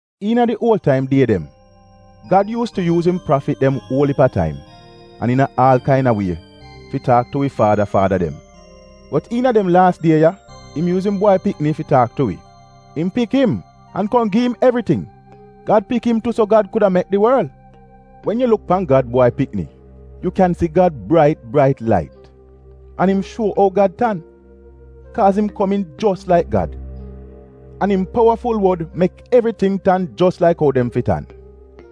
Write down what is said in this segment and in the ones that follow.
Iina di uol taim die dem Gad yuus tu yuuz im prafit dem uol iip a taim, an iina aal kaina wie fi taak tu wi faada faada dem. Bot iina dem laas die ya, im yuuz im Bwai Pikni fi taak tu wi. Im pik im, an kom gi im evriting. Gad pik im tu, so Gad kuda mek di worl. Wen yu luk pan Gad Bwai Pikni, yu kyan si Gad brait brait lait. An im shuo ou Gad tan, kaaz im komiin jos laik Gad. An im powaful wod mek evriting tan jos laik ou dem fi tan.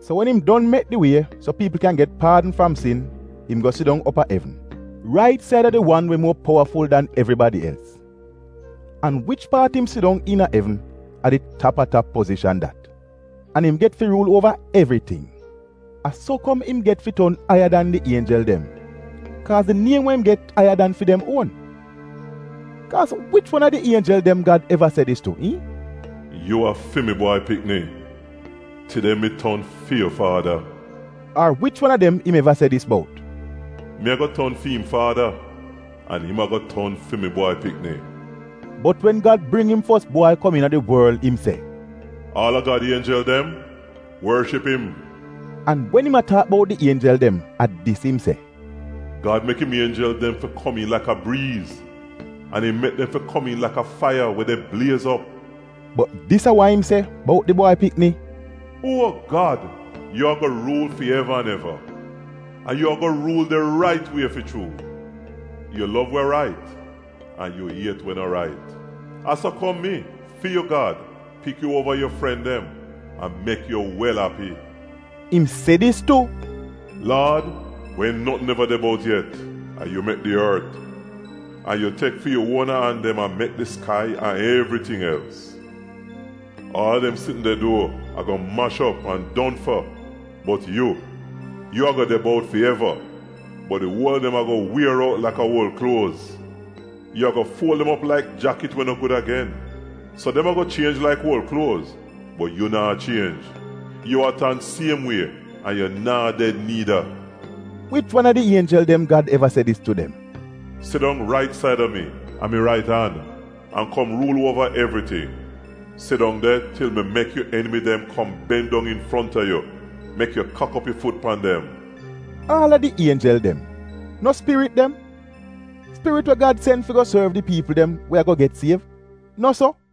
So wen im don mek di wie so piipl kyan get paadn fram sin im go sidong op a evn, rait saida di wan we muo powaful dan evribadi els. An wich paat im sidong iina evn, a di tap-a-tap pozishan dat, an im get fi ruul uova evriting. A so kom im get fi ton aiya dan di ienjel dem, kaaz di niem we im get aiya dan fi dem uon. Kaaz wich wan a di ienjel dem Gad eva se dis tu, iihn, “Yu a fi mi Bwai Pikni; tide mi ton fi yu faada”? Ar wich wan a dem im eva se dis bout, “Mi ago ton fi'im faada, an im ago ton fi mi Bwai Pikni”? Bot wen Gad bring bak im fos bwai kom iina di worl, im se, “Aal a Gad ienjel dem — worship im!” An wen im a taak bout di ienjel dem, a dis im se, “Gad mek im ienjel dem fi komiin laka briiz, an im mek dem fi komiin laka faiya we de bliez op.” Bot dis a wa im se bout di Bwai Pikni, “Uo Gad! Yu ago ruul fi eva an eva! An yu ago ruul di rait wie fi chuu. Yu lov wa rait, an yu iet wa no rait. A so kom mi, fi yu Gad, pik yu uova yu fren dem an mek yu wel api. Im se dis tu, “Laad, wen notn neva de bout yet, a yu mek di ort. An yu tek fi yu uona an dem an mek di skai an evriting els. Aal a dem sitn de duo, ago mash op an don fa, bot yu — yu ago de bout fi eva, bot di uol a dem ago wier out laka uol kluoz. Yu ago fuol dem op laik jakit we no gud agen. So dem ago chienj laik uol kluoz, bot yu naa chienj, yu a tan siem wie an yu naa ded niida.” Wich wan a di ienjel dem Gad eva se dis tu dem: “Sidong rait saida mi, a mi rait an, an kom ruul uova evriting. Sidong de til mi mek yu enimi dem kom ben dong infronta yu, mek yu kak op yu fut pan dem”? Aal a di ienjel dem, no spirit dem; spirit we Gad sen fi go sorv di piipl dem we ago get siev? No so?